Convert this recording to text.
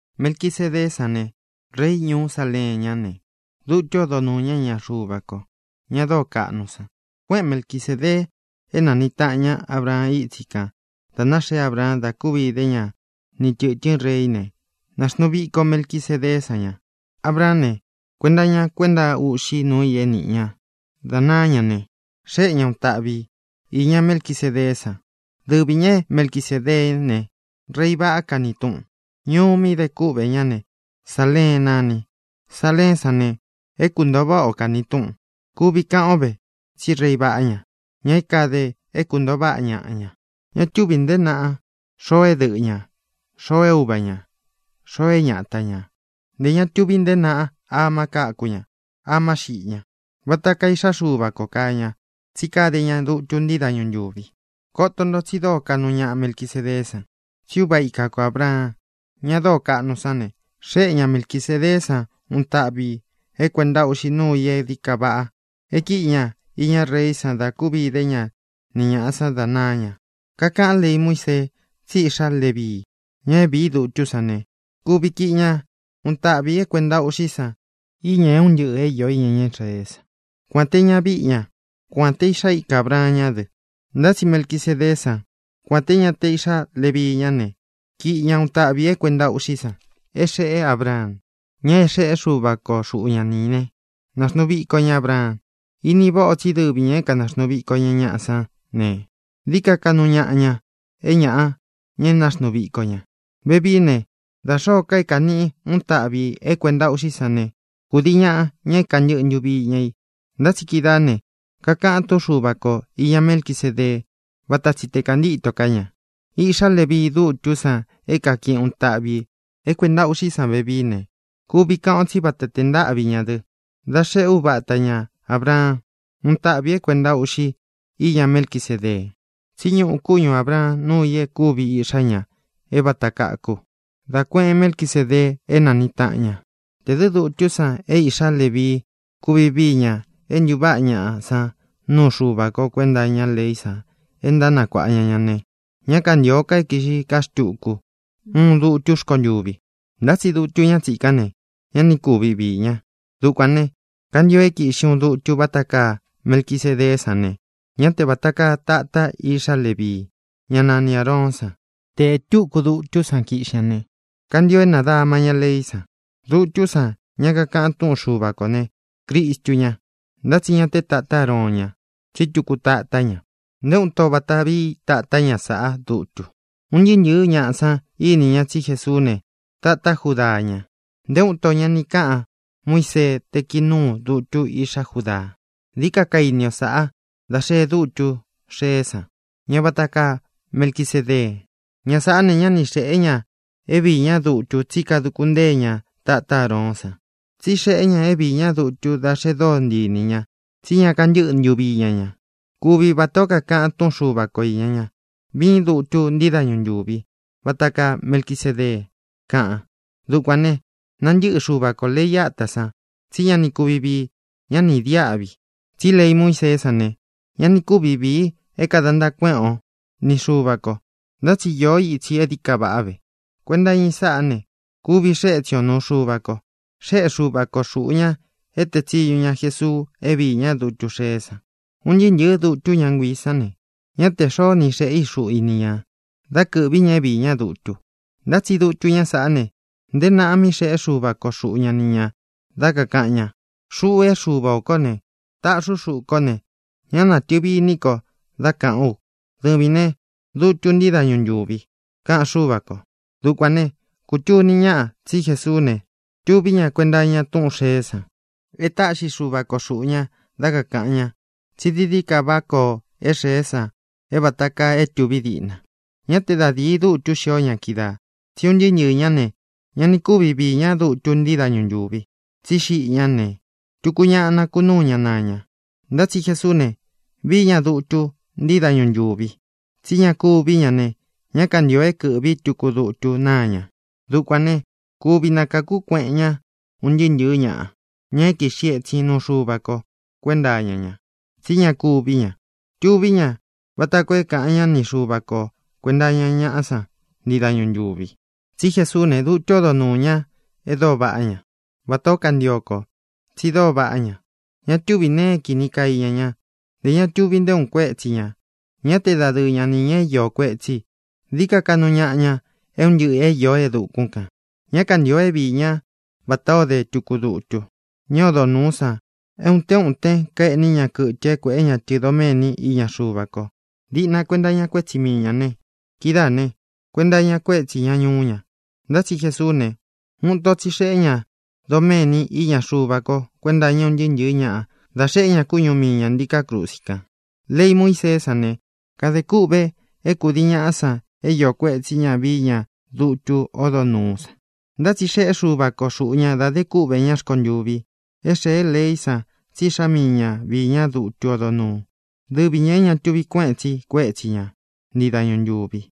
Melquisedeé san ne, rei ñuú Saleen ñá ne, dutu ódo nūu ña iña Xuva ko, ña dóo kaꞌnu san. Kuéꞌen Melquisēdee é nāniꞌi taꞌan ña Ábraan ítsi kān da náxee Abraan da kúvi idé ña ni tɨ̄tɨ́n reí ne, nāxnuu viko Melquisedeé san ña. Abraán ne, kuenta iña kuenta uꞌxi núu i é nīꞌi ña dá naá ña ne, xéꞌe ña uun taꞌvi i īña Melquisedeé san. Dɨvī ña é Melquisēdeé ne, “rei vaꞌá” kani túꞌun. Ñuu mí de kúꞌvē ñá ne, Saleen nani. Saleén san ne, “é kuntōo váꞌa ō” kani túꞌun. Kuvi kaꞌan o ve tsí rei vaꞌá ña, ña é kāde é kuntōo váꞌa ñaꞌa ña. Ña túvī nteé naꞌa xoo é dɨꞌɨ ñā, xoo é uva ñā, xoo é ñata ñā. Ntē ña tuvi nteé naꞌa ama káku ña, ama xiꞌi ña. Vata kaa Iꞌxá Xuva kō kaa ña, tsí kade ña dutu ntii dáñu ntūvi. Koto nto tsi dóo kaꞌnu ñaꞌa Melquisedeé san. Tsí uva ika ko Ābraan, ña dóo kaꞌnu sán ne, xéꞌe ña Melquisēdeé san uun taꞌvi ī é kuēnta uꞌxi núu i e dií ka vaꞌa é kīꞌi ña iña reí san da kúvi idé ña ni ñāꞌa san dá naá ña. Kakaꞌan lei Muísee tsí iꞌxá Levii, ña é vīi dutú san ne, kuvi kiꞌi ña uun taꞌvi ī é kuēnta uꞌxí san iña é un ntɨꞌɨ̄ é iō iña ña Israeé san, kuān te ñavíꞌi ña, kuān te iꞌxá ika Ābraan ñá dɨ. Ntá tsi Melquisedeé san, kuān te ña te iꞌxá Levii ñá ne, kiꞌi ña uun taꞌvi ī é kuēnta uꞌxí san é xeꞌé Abraan, ña é xeꞌé Xuva ko xuꞌu ña ni ī né, nāxnuu viko ña Abraan. Ini váꞌa ō tsí dɨvi ñā é kanāxnuu viko ña ñaꞌa sán ne, dií ka kaꞌnu ñaꞌa ña é ñāꞌa, ña é nāxnuu viko ña. Vevií ne, da xōó ka é kāniꞌi i uun táꞌvi ī é kuēnta uꞌxí san ne, kudiī ñaꞌa, ña é kāntɨꞌɨ ntuvi iña i. Ntá tsi kídaā ne, kakaꞌan túꞌun Xuva ko īña Melquisédee váta tsi te kāntíto ká ña. Iꞌxá Levii, dutú san é kākiꞌi uun táꞌvi ī é kuēnta uꞌxí san vevií ne, kuvi kaꞌan o tsí vata tē ntáꞌvi ña dɨ dá xeꞌé uvata ña Ābraan úun táꞌvi ī é kuēnta uꞌxi íña Melquisédee. Tsí ñuꞌu kúñu Ābraan núu i é kūvi iꞌxá ña é vāta kaku, da kuéꞌen Melquisedee é nāniꞌi taꞌan ña. Tē dɨ dutú san é īꞌxá Levii kuvi víi ña é ntūváꞌa ñaꞌa san nuu Xuva ko kuenta iñá leí san e ntánakuāꞌa ña ña ne, ñá kantīo é kīꞌxi ká xtuku uun dutú rkontuvi. Ntá tsi dutu ñá tsīkán ne, ña ni kúvi viī ña. Dukuān ne, kantio é kīꞌxi uun dutu váta kaa Melquisedeé san ne, ñá te vāta kaa tatá iꞌxá Levii, ñá nani Āroón san. Te ē túku dutú san kiꞌxi ña ne, kantio é nādama ña leí san. Dutú san, ña kakaꞌan túꞌun Xuva kō ne, Cristu ña. Ntá tsi ña te tatá Aroon ña, tsí tuku tatá ña. Nté uun ito vata vií tatá ña sāꞌá dutu. Un ntɨɨ́ ntɨ̄ɨ́ ñaꞌa san ini ña tsí Jesuú ne, tatá Judaa ña. Nté uun ito ña ni káꞌan Muiseé te kii nūu dutu íꞌxá Judaa. Dií ka kaini o sáꞌā dá xee dútu xeé san, ña vata kaa Melquisedee. Ña sāꞌá ne, ñá ni xēe ña é viī ñá dutu tsí kaduku ntée ña tatá Aroón san, tsi xée ñā é viī ñá dutu dá xe dóo ntii inī ña tsí ña kantɨ́ꞌɨ ntuvi iña ña. Kuvi vatā ó kakaꞌan túꞌun Xuva ko īña ña: Viín dutu ntii dáñu ntūvi, vata kaa Melquisedee, kaꞌan. Dukuān né, nantɨꞌɨ Xuva kō lei átā san, tsí ña ni kuvi vii, ñá ni īdiáꞌvi. Tsí lei Muíseé san ne, ña ni kúvi vīi é kāda ntaa kuéꞌen o ni Xuva kō. Ntá tsi īó itsi e dií ka vaꞌá ve. Kuenta iña i sáꞌā ne, kuvi xee étsin o nūu Xuva ko. Xéꞌe Xuva ko xūꞌu ña é tēe tsiñu ña Jesuu é viī ñá dutu xeé san. Un ntɨɨ́ ntɨ̄ɨ́ dutu ñá nguiī sán ne, ñá te xōó ni xeꞌē í xuꞌu i ni ñā dá kɨ̄ꞌví ña é viī ñá dutu. Ntá tsi dutu ñá saꞌá ne, nteé naꞌa mí xēꞌé Xuva ko xuꞌu ña ni ñā dá kakāꞌan ña: Xuꞌu é Xuva ō kó ne, taꞌxi ú xuꞌu kó ne, ñá nātɨvi iní ko dá kāꞌán u: “Dɨvīn né, dutun ntii dáñu ntūvi”, kaꞌan Xúva kō. Dukuān né, kūtuni ñáꞌa tsi Jesuú ne, tuví ña kuenta iña túꞌūn xeé san e táꞌxi Xuva ko xūꞌu ña dá kakāꞌan ñá tsi dií dií ka vaꞌá koo é xēé san é vāta kaa é tūví diꞌna. Ñá te da dīi dutu xió ña kídaā, tsí un ntɨɨ́ ntɨɨ̄ ñá ne, ña ni kúvi viī ñá dutu ntii dáñu ntūvi, tsí xiꞌi ñá ne, tuku ñaꞌa nakunúu ña naa ña. Ntá tsi Jesuú ne, vií ña dutu ntii dáñu ntūvi, tsí ña kúvī ñá ne, ñá kantīo é kɨ̄ꞌví tuku dutu náa ña. Dukuān ne, kuvi nakáku kueꞌen ña un ntɨɨ́ ntɨ̄ɨ́ ñaꞌa, ña é kīꞌxi etsin nuu Xuva ko kuenta iña ña, tsí ña kúvī ña. Tuví ña vata koo é kāꞌan ñá ni Xuva ko kuēnta iña ñaꞌá san ntii dañu ntūvi. Tsi Jesuú ne, dutu ódo nuū ñá e dóo vaꞌá ña, vatā ó kantio ko. Tsi dóo vaꞌá ña. Ña túvī nee é kīni kaa iña ñá, ntē ña tuvi nté uun kuétsi ñā. Ñá te dadɨɨ ña nī ña é iō kuetsí i. Dií ka kaꞌnu ñaꞌa ña é un ntɨꞌɨ̄ é īó e dukún kān. Ña kantío é viī ñá vatā ó de tuku dutu ñá odo nūú san é ūtén utén kaeꞌní ña kɨtɨ é kuēꞌé ña tɨ doméni iña Xuva ko, diꞌna kuenta iña kuétsi mii ñā ne, kidáā ne, kuenta iña kuétsī ña ñuú ña. Ntá tsi Jesuú ne, uun ito tsi xeꞌé ña doméni iña Xuva ko kuenta iña ún ntɨɨ́ ntɨ̄ɨ́ ñaꞌa dá xeꞌé ña kúñu mii ñā ntíkā krusi kan. Lei Muíseé san ne, kadē kûꞌve é kūdii ñaꞌá san é io kuētsí ña vií ña dutu ódo nūú san. Ntá tsi xeꞌé Xuva ko xūꞌu ña dá de kúꞌvē ña rkontuvi é xēé leí san tsí Iꞌxá mii ña viī ñá dutu ódo nūú, dɨvi ñā é ña tuvi kuéꞌen tsi kuétsi ña ntii dañu ntūvi.